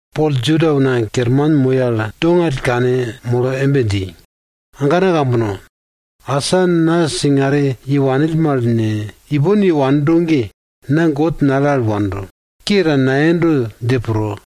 Pol Juda una kerman moi al dongall kanmolo embe dji, agana kambono, asa na singare yewanill mal ne, ipon yewando ge, na God nale al wando, ke ta nayendo dje pro.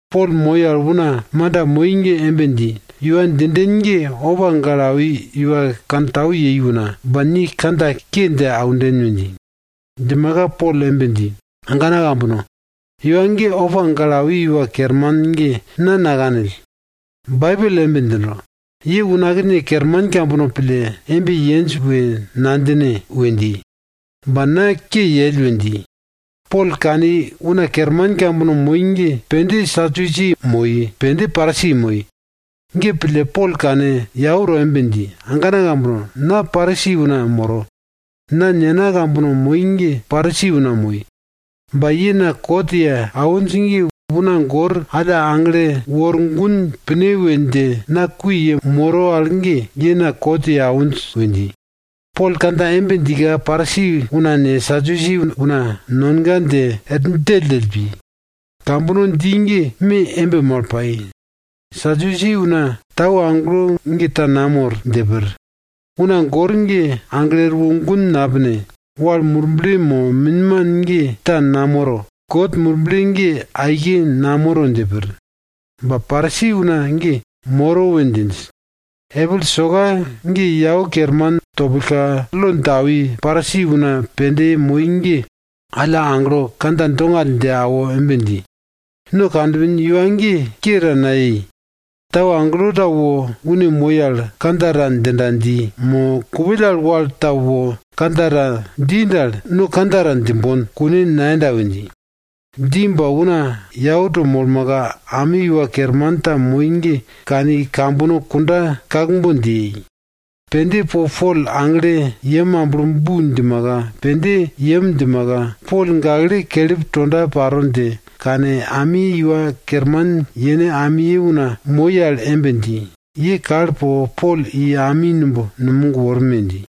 Pol moi al una manda moi ge embe dji, iwa djinden ge opa gale awi iwa kantau yei una, ba ni kandja ke dje aunden we dji. Djimaka Pol embe dji, agana kambono, iwa ge opa gale awi iwa kerman ge na nakanill. Baibel embe djindo, ye unakne kerman kambono pille embe yenj we nadjine we dji, ba na ke yell we dji. Pol kani, una kerman kambono moi ge pende Sadusi una moi, pende Parisi moi. Ge pille, Pol kane yau to embe dji, agana kambono! Na Parisi una moro. Na nena kambono moi ge Parisi una moi, ba ye na kot ye awinj ge una gor alla aglo wor gun pine we dje na kui yemoro al ge, ye na kot ye awinj we dji. Pol kandja embe djika, Parisi una ne, Sadusi una nonga dje er djelldjell pi. Kambono dji ge me embe mal pai. Sadusi una tau agelo ge ta namor dje pir. Una gor ge aglo erwo gun napine. Wal murble mo minman ge ta namoro. God Murble ge aike namoro dje pir. Ba Parisi una ge moro we djinj. Epil soka ge yau kerman topillka, lo dje awi Parisi una pende moi ge alla aglo kandja dongall dje awo embe dji, no kanpin iwa ge ke ta nayei. Tau agelo ta wo une moi al kandja ta djinda dji, mo kupill al wal ta wo kandja ta dji dal, no kandja ta djimbon, kune nayenda we dji. Dji ba una yau to molmaka, ami iwa kerman ta moi ge kani kambono kunda kakbon dje yei. Pende po Pol agle yem amblo bu djimaka, pende i yem djimaka, Pol gakle kelip tonda paro dje kane, ami iwa kerman yene amiye una moi al embe dji, ye kal po Pol i ami numb numog worme dji.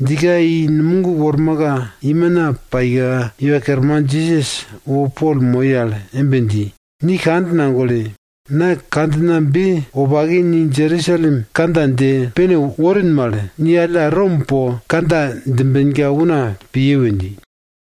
Djika i numog wormaka, imina paika, Iwa Kerman Jisas wo Pol moi al embe dji, ni kand nagole. Na kandjinabe wopake ni Jerusalem kandja dje pene worin mal, ni alla Rom po kandja djimbenka una piye we dji.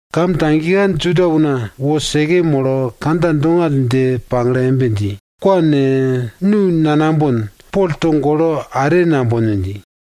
Kam tagika Juda una wo seke molo kandja dongall dje pagle embe dji, kwa ne, nu nanambon, Pol togolo are nambon we dji.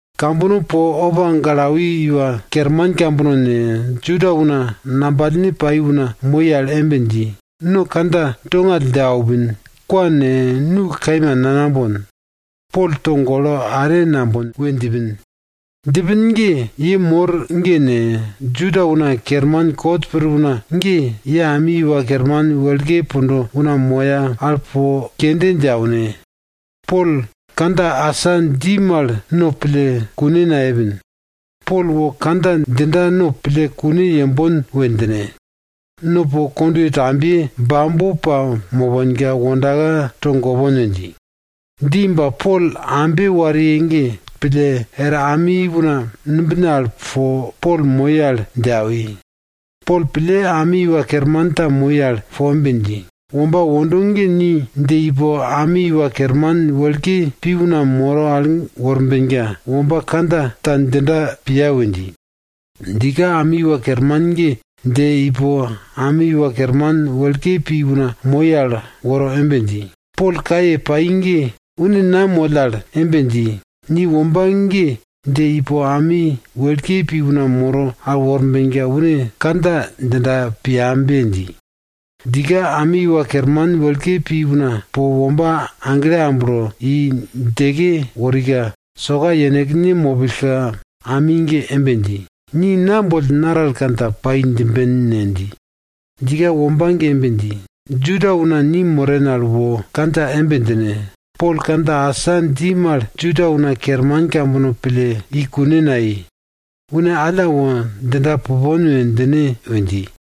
Kambono po opa gale awi iwa kerman kambono ne, Juda una ngambalne pai una moi al embe dji, no kandja dongall dje aupin. Kwa ne, nu kaima nanambon. Pol togolo are nambon we djipin. Djipin ge ye mor ge ne, Juda una kerman kot pir una ge, ye ami iwa kerman wekle pundo una moya al po kende dje aune, Pol kandja asa dji mal no pille kune nayepin. Pol wo kandja djinda no pille kune yembon we djine. No po kondwe tambiye bambo pamoponka wondaka togopon we dji. Dji ba Pol ambe wariye ge pille er ami una numbine al po Pol moi al dje awi. Pol pille ami iwa kerman ta moi al po embe dji, womba wondo ge ni dje ipo ami iwa kerman wekle pi una moro al worbenka, womba kandja ta djindaka piya we dji. Djika ami iwa kerman ge dje ipo ami iwa kerman wekle pi una moi al woro embe dji, Pol kaye pai ge une na moll al embe dji, ni womba ge dje ipo ami wekle pi una moro al worbenka, une kandja djindaka piyambe dji. Djika ami iwa kerman wekle pi una po womba agle amblo i djeke worika, soka yenekne mopillka ami ge embe dji, ni na boll naral kandja pai djimben ne? dji. Djika womba ge embe dji, Juda una ni moren al wo kandja embe djine, Pol kandja asa dji mal Juda una kerman kambono pille i kune nayei. Une alla wo djinda pupon we djine we dji.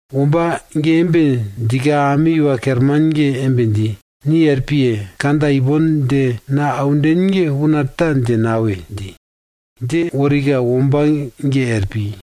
Womba ge embe djika ami iwa kerman ge embe dji, ni er piye! Kandja ipon dje na aunden ge una ta dje nawe! dji. Dje worika womba ge er pi.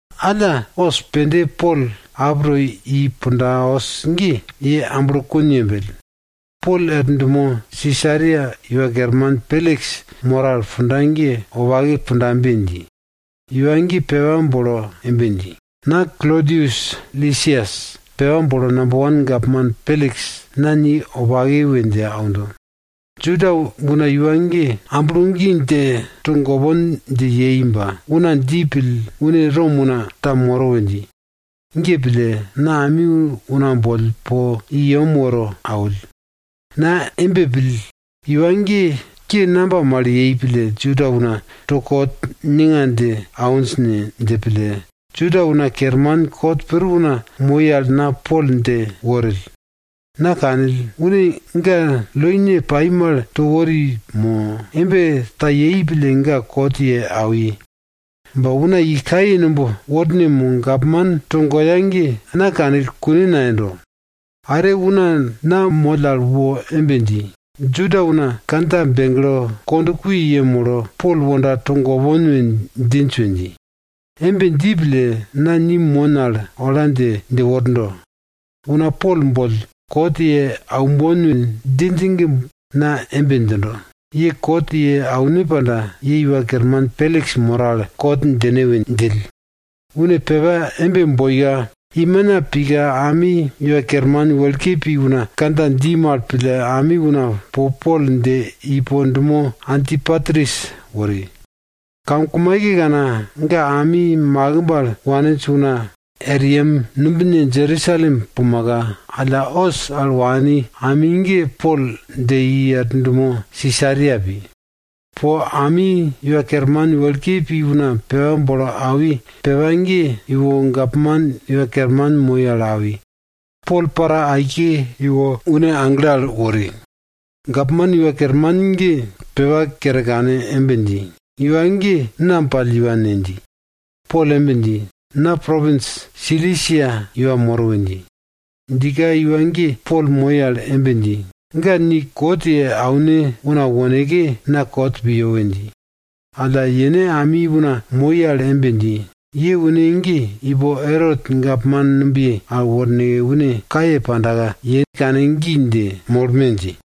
Alla os pende Pol ap to i punda os ge, ye amblokun yembell. Pol er dumo Sisaria iwa kerman Peliks moro al punda ge wopake pundabe dji. Iwa ge pepa bolo embe dji, na Klodius Lisias pepa bolo namba wan gapman Peliks, na ni wopake we dje aundo. Juda una iwa ge amblo gi dje togopon dje yei ba, una dji pill une Rom una ta moro we dji. Ge pille, na ami una boll po i yem woro awill. Na embe pill, iwa ge ke namba mal yei pille Juda una to kot ninga dje awinj ne? dje pille, Juda una kerman kot pir una moi al na Pol dje worill. Na kanill, une ga loine pai mal to wori mo embe ta yei pille ga kot ye awi. Ba una i kaye numb worne mo gapman togoya ge na kanill kune nayendo. Are una na moll al wo embe dji, Juda una kandja begle kond kui yemolo Pol wonda togopon we djinj we dji. Embe dji pille, na ni mon al ola dje, dje wordo. Una Pol boll kot ye aumbon we djinj ge na embe djindo, ye kot ye aune panda, ye iwa kerman Peliks moro al kot djine we djill. Une pepa embe boika, imina pika ami iwa kerman wekle pi una kandja dji mal pille ami una po Pol dje ipo dumo Antipatris wori. Kamkumaikekana, ga ami makimb al waninj una er yem numbine Jerusalem pumaka, alla os al wani ami ge Pol dje i er dumo Sisaria pi. Po ami iwa kerman wekle pi una pepa bolo awi pepa ge iwo gapman iwa kerman moi al awi. Pol para aike iwo une agle al wori. Gapman iwa kerman ge pepa kere kane embe dji, iwa ge nam pall iwa ne? dji. Pol embe dji, na propins Silisia iwa moro we dji. Djika iwa ge Pol moi al embe dji, ga ni kot ye aune una woneke, na kot piyo we dji. Alla yene ami una moi al embe dji, ye une ge ipo Erot gapman numbiye al worneke une kaye pandaka, ye kane gi dje molme dji.